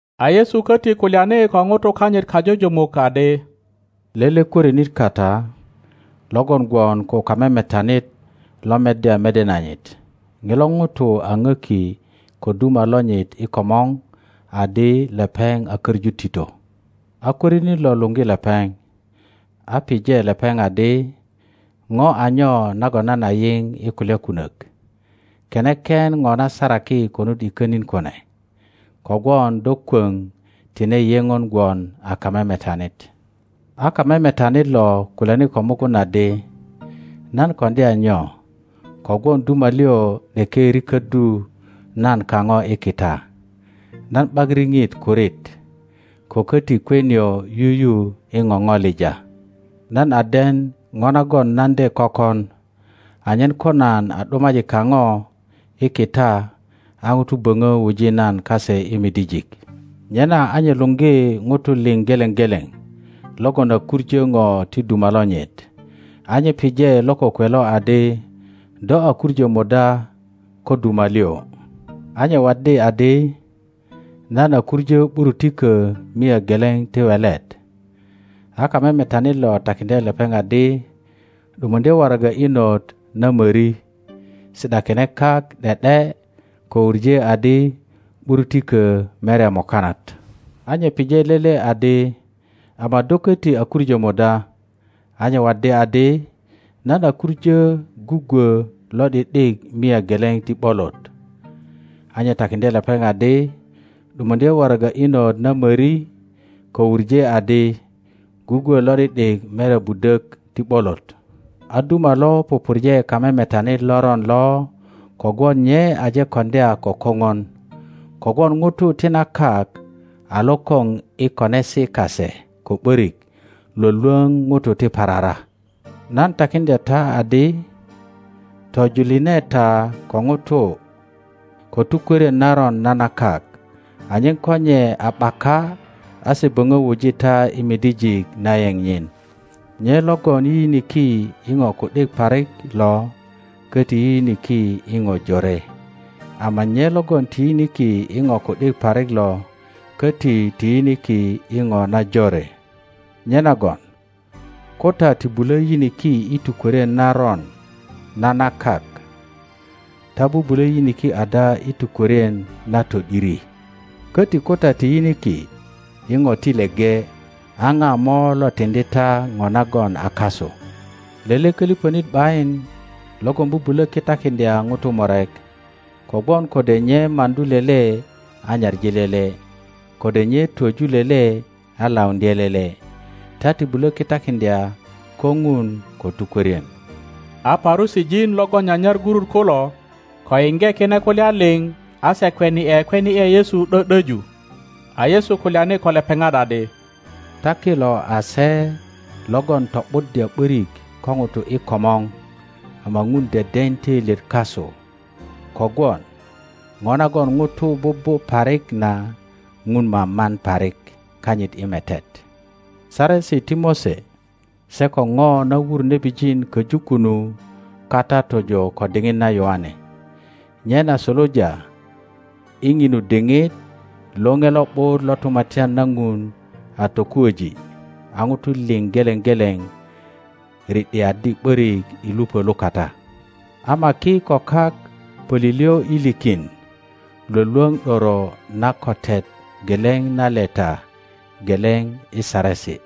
A Yesu koti kulyani ko ŋutukanyit kajujumuk adi, Lele kworinit kata lo gwon ko kamemetanit lo meddya mede nanyit. Ŋilo ŋuto a ŋöki ko duma lonyit i komor adi lepeŋ a köŋu tito. a kwörinit lo luŋgi lepeŋ, a pije lepeŋ adi, Ŋo a nyo nagon nan a yiŋ i kulya kunök? Kene ken ŋo na saraki konut i konin kune, kogwon do kwoŋ tine yeŋon gwon a kamemetanit. A kamemetanit lo kulyani ko mugun adi, Nan koŋdya nyo kogwon duma liŋ ’deke riköddu nan kaŋo i kita? Nan ’bak riŋit kurit, ko koti kwe nio yuyu i ŋoŋolija. Nan a den ŋo nagon nan de kökon, anyen ko nan a ’dumaji kaŋo i kita, a ŋutu böŋö wuji nan kase i midijik. Nyena a nye luŋgi ŋutu liŋ geleŋ geleŋ logon a kuŋo ŋo ti duma lonyit. A nye pije lo kokwe lo adi, Do a kuŋo muda ko duma liŋ? A nye waddi adi, Nan a kuŋö ’burutikö mia geleŋ ti welet. A kamemetanit lo takiŋdye lepeŋ adi, ’Dumuŋdye waraga inot na mori; si ’dakine kak ’de ’de, ko wuŋe adi, ’Burutikö merya mukanat. A nye pije lele adi, Ama do köti a kuŋö muda? A nye waddi adi, Nan a kuŋo gugwö lo ’di ’dik mia geleŋ ti ’bolot. A nye takiŋdye lepeŋ adi, ’Dumuŋdye waraga inot na möri, ko wuŋe adi, Gugwö lo ’di ’dik merya budök ti ’bolot. A duma lo pupurje kamemetanit loron lo kogwon nye aje koŋdya ko koŋon. Kogwon ŋutu ti na kak a lokoŋ i konesi kase ko ’börik lwölwöŋ ŋutu ti parara. Nan takiŋdya ta adi, Tojuline ta ko ŋutu ko tukwörien naron na na kak, anyen ko nye a ’baka a se böŋö wuji ta i midijik na yeŋ nyin. Nye logon yiyiniki i ŋo ku ’dik parik lo köti yiyiniki i ŋo jore, ama nye logon ti yiniki i ŋo ku ’dik parik lo köti ti yiniki i ŋo najore. Nyenagon ko ta ti bulö yiniki i tukwörien naron na na kak, ta bubulo yiniki ada i tukwörien na to ’diri? Köti ko ta ti yiniki i ŋo ti leŋe, a ŋa mo lo tiŋdi ta ŋo nagon a kasu? Lele köliŋönit ’bayin logon bubulo kitakiŋdya ŋutu murek; kogwon kode nye maŋdu lele a nyaŋi lele, kode nye twöju lele a lauŋdye lele. Ta ti bulo kitakiŋdya ko Ŋun ko tukwörien. A Parusijin logon nyanyar gurut kulo, ko yiŋge kine kulya liŋ, a se kweni ’e kweni ’e Yesu ’dö ’döju. A Yesu kulyani ko lepeŋat adi, Ta kilo a se logon to ’buddya ’börik ko ŋutu i komor, ama Ŋun deden töilyet kasu, kogwon ŋo nagon ŋutu bubu parik na Ŋun maman parik kanyit i metet. Saresi ti Mose se ko ŋo na wur nebijin köju kunu kata tojo ko diŋit na Yoane, nyena suluja i ŋinu diŋit Loŋe Lo ’but lo Tumatyan na Ŋun a tokuoji, a ŋutu liŋ geleŋ geleŋ ri ’diaddi ’borik i lupö lukata. Ama ki ko kak pölilyo i likin Iwolwoŋ ’doro na kotet geleŋ na leta geleŋ i Saresi.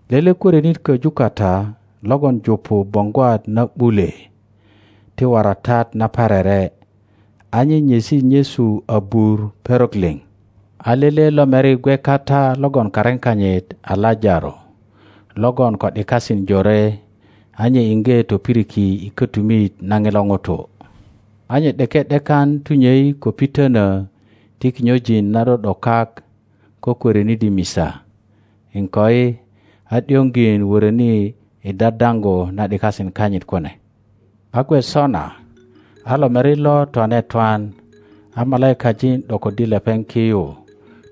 Lele kworinit köju kata logon jupu boŋgwat na ’bule ti waratat naparere, a nye nyesi nyesu abur perok liŋ. A lele lomeri gwe kata logon karin kanyit a Lajaro logon ko ’dikasin jore, a nye iŋge topiriki i kotumit na ŋilo ŋutu. A nye ’deke ’dekan tunyei ko pitönö ti kinyojin na ’do ’do kak ko kwörinit i misa, iŋkoi, a ’dioŋjin woröni i dadaŋgu na ’dikasin kanyit kune. A gwe sona a lomeri lo twane twan, a malaikajin ’dokoddi lepeŋ ki yu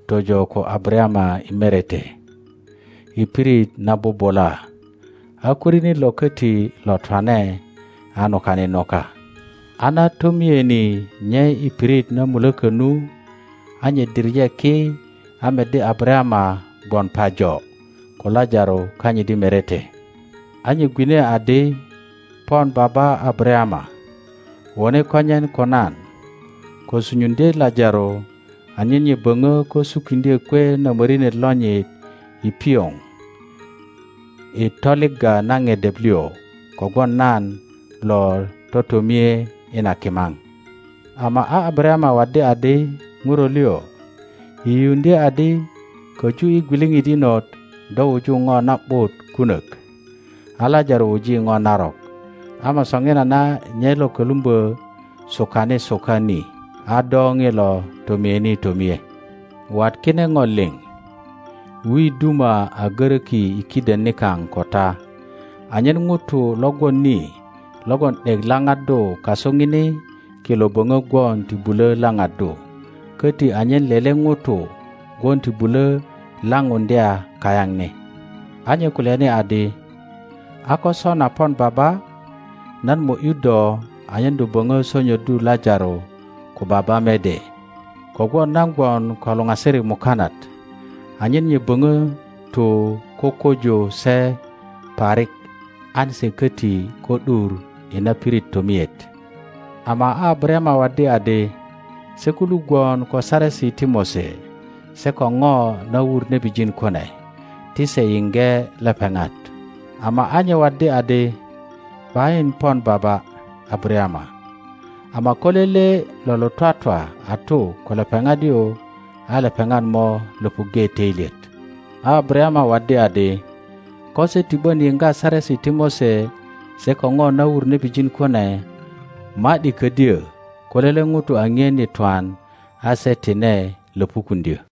tojo ko Abarayama i merete, i pirit na bubula, a kworinit lo koti lo twane, a nukani nuka. a na tomieni nye i pirit na mulöko nu, a nye diŋe ki, a meddi Abarayama gwon pajo, ko Lajaro kanyit i merete. a nye gwine adi, Pon Baba Abarayama, wone konyen ko nan, ko sunyuŋdye Lajaro anyen nye boŋö ko sukiŋdyö kwe na morinet lonyit i pioŋ i toligga na ŋedep liŋ, kogwon nan lo totomie i na kimaŋ. Ama a Abarayama waddi adi, Ŋuro liŋ, yiyiuŋdye adi, Koju i gwiliŋit inot do wuju ŋo na ’but kunok, a Lajaro wuji ŋo narok; ama soŋinana nye lo kolumbö sukani suka ni, a do ŋilo tomieni tomie. Wat kine ŋo liŋ, wi duma a goroki i kiden nikaŋ ko ta, anyen ŋutu lo gwon ni logon ’dek laŋaddu kasu ŋini kilo boŋö gwon ti bulo laŋaddu, koti anyen lele ŋuto gwon ti bulö laŋuŋdya kayaŋ ni. a nye kulyani adi, A ko sona pon baba, nan mo ’yu do anyen do boŋö sonyoddu Lajaro ko baba mede, kogwon nan gwon ko luŋasirik mukanat, anyen nye böŋo tu kukuju se parik an se koti ko ’dur i na pirit tomiet. Ama a Abarayama waddi adi, Se kulu gwon ko Saresi ti Mose se ko ŋo na wur nebijin kune, ti se yiŋge lepeŋat. Ama a nye waddi adi, ’Bayin pon baba Abarayama; ama ko lele lo lo twatwa a tu ko lepeŋat yu, a lepeŋat mo löpuŋge toilyet. A Abarayama waddi adi, Ko se ti ’bon yiŋga Saresi ti Mose se ko ŋo na wur nebijin kune, ma ’di ködyö ko lele ŋuto a ŋien i twan a se tine lopukuŋdyö.